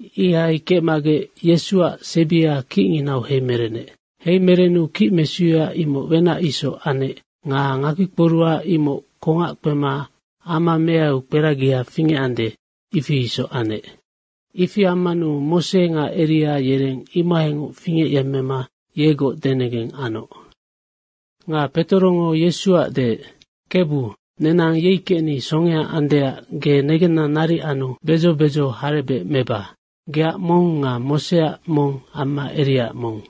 Ihai kecmagec Yesuac sebia kicnginau heimerenec. Heimerenu kicmesuya imoc wenac isoc anec nga ngakpikporuha imoc kongac kpema ama meaiu kperagia fingecande, ifi isoc anec. Ifi ammanu Mose nga Eria yereng imohaingoc fingecyemmema yegoc denegeng anoc. Nga Petorongo Yesuac deec, “Kebu, nenang yei kecni songea andeac ge negenna naric anu bedzo bedzo harebec meba. Geac mong nga Moseac mong amma Eriaac mong.”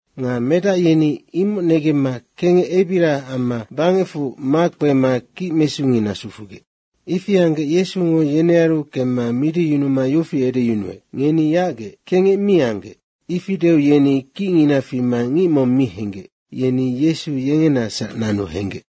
Nga medac yeni imoc negemma kengec ebiria amma bangecfu makpema kicmesungina sufugec. Ifi anggec Yesungo yenearu kemma midiyunuma yofi edeyunuec, “Ngeni yacgec, kengec mi anggec.” ifi deu yeni kicngina fima ngic mong mi henggec, yeni Yesu yengenasac nanu henggec.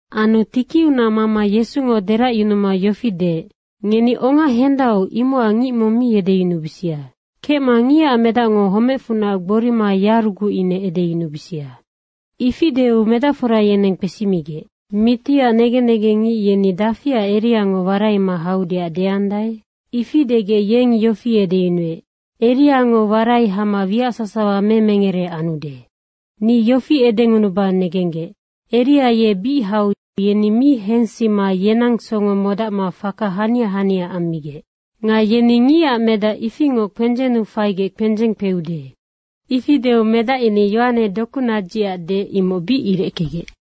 Anu tikiunac mama Yesungo deracyunuma yofi deec, “Ngeni onga hendau, imocac ngic mong mi edeyunubisia. Kecma Ngicac Medacngo homecfunac gborima yaruguc ine edeyunubisia.” ifi deu medacfora yeneng kpesimigec, “Mitiac negen negengngic yeni dafiac Eriango waraima haudeac deandae?” ifi degec yeng yofi edeyunuec, “Eriango warai hama wiac sasawa memengere anudenoc.” Ni yofi edengunuba negenggec, “Eria ye bic hau yeni mi hensima yenang songo modacma faka hania hania ammigec. Nga yeni Ngicac Medac ifingoc kpendzennu faigec kpendzeng kpeude.” Ifi deu medac yeni Yohane dokunadzicac deec, imoc bic irickegec.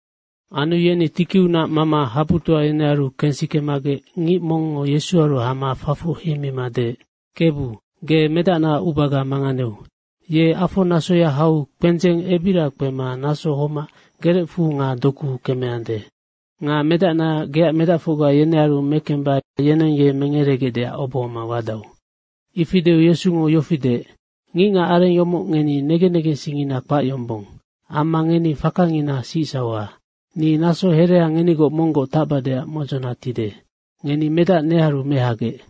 Anu yeni tikiunac mama habutoa yenearu kensikemagec ngic mongngo Yesuaru hama fafoc heimima deec, “Kebu, ge medacnaac ubaga manganeu. Ye afonasoya hau kpendzeng ebiria kpema naso homac gerecfu nga dokuu kemeande. Nga medacna geac medacfocga yenearu mekemba yeneng ye mengeregecdeac obohoma wadau.” Ifi deu Yesungo yofi deec, “Ngicngac areng yomoc ngeni negen negensingngina kpac yombong amma ngeni fakangina sicsauha. Ni naso herea ngenigoc monggoc tacbadeac modzona tide. Ngeni medac nearu mehagec.”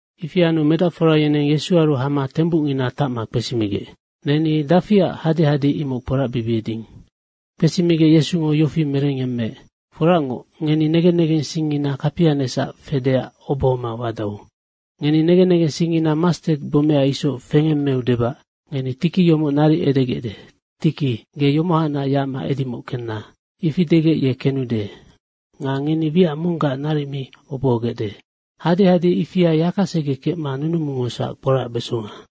Ifi anu medacfora yeneng Yesuaru hama tembucngina tacma kpesimigec, “Neni dafiac hadehade imoc kporacbibieding?” Kpesimigec Yesungo yofi merengyemmeec, “Foracngoc, ngeni negen negensingngina kapianecsac fedeac obohoma wadau. Ngeni negen negensingngina mastet gbomea isoc fengemmeu debac ngeni tiki yomoc naric edegecde, ‘Tiki, ge yomohacnac yacma edimoc kenna.’ Ifi edegec ye kenude. Nga ngeni wiac monggac naric mi obohogecde. Hadehade ifia yakasege kecma nunumungosac kporacbesonga.”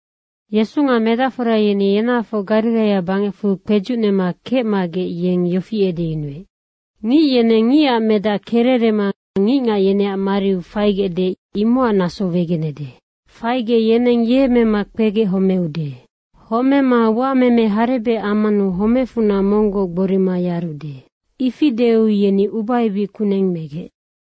Yesu nga medacfora yeni yenahafoc Gariraia bangecfu kpedzucnema kecmagec yeng yofi edeyunuec, “Ngic yeneng Ngicac Medac kererema ngicngac yeneac mariu faigecde, imocac naso wegenede. Faigec yeneng ye mema kpegec homeude. Homema uameme harebec ammanu homecfunac monggoc gborima yarude.” ifi deu yeni ubaebic kuneng megec.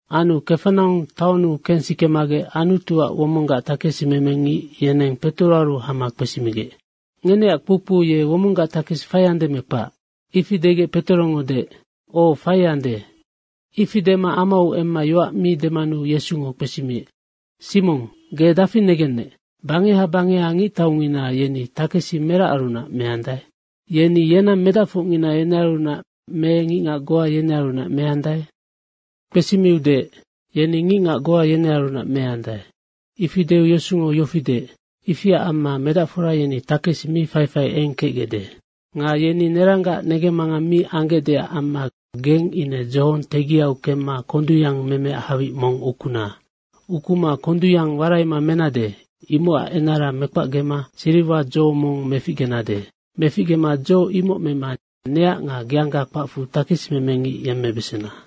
Anu Kafanaung taonnu kensikemagec Anutuac womonggac takesimemengic yeneng Petoroaru hama kpesimigec, “Ngeneac kpoukpou ye womonggac takesi faiande me kpac?” ifi degec Petorongo deec, “Oc, faiande.” Ifi dema amau emma yoac mi demanu Yesungo kpesimiec, “Simong, ge dafi negennec, bangeha bangeha ngictaungina, yeni takesi meracarunac meandae? Yeni yenang medacfocngina, yenearunac me ngicngac goa yenearunac meandae?” Kpesimiu deec, “Yeni ngicngac goa yenearunac meandae.” ifi deu Yesungo yofi deec, “Ifiac amma medacfora yeni takesi mi faifai eng kecgecde. Nga yeni neranggac negemmangang mi anggecdeac amma geng ine dzohong tegiau kemma kondungyang memeac hawic mong ukuna. Ukuma kondungyang waraima menade, imocac enara mekpacgema siriwadzo mong meficgenade. Meficgema dzo imoc mema neac nga geangga kpacfu takesimemengic yemmebesena.”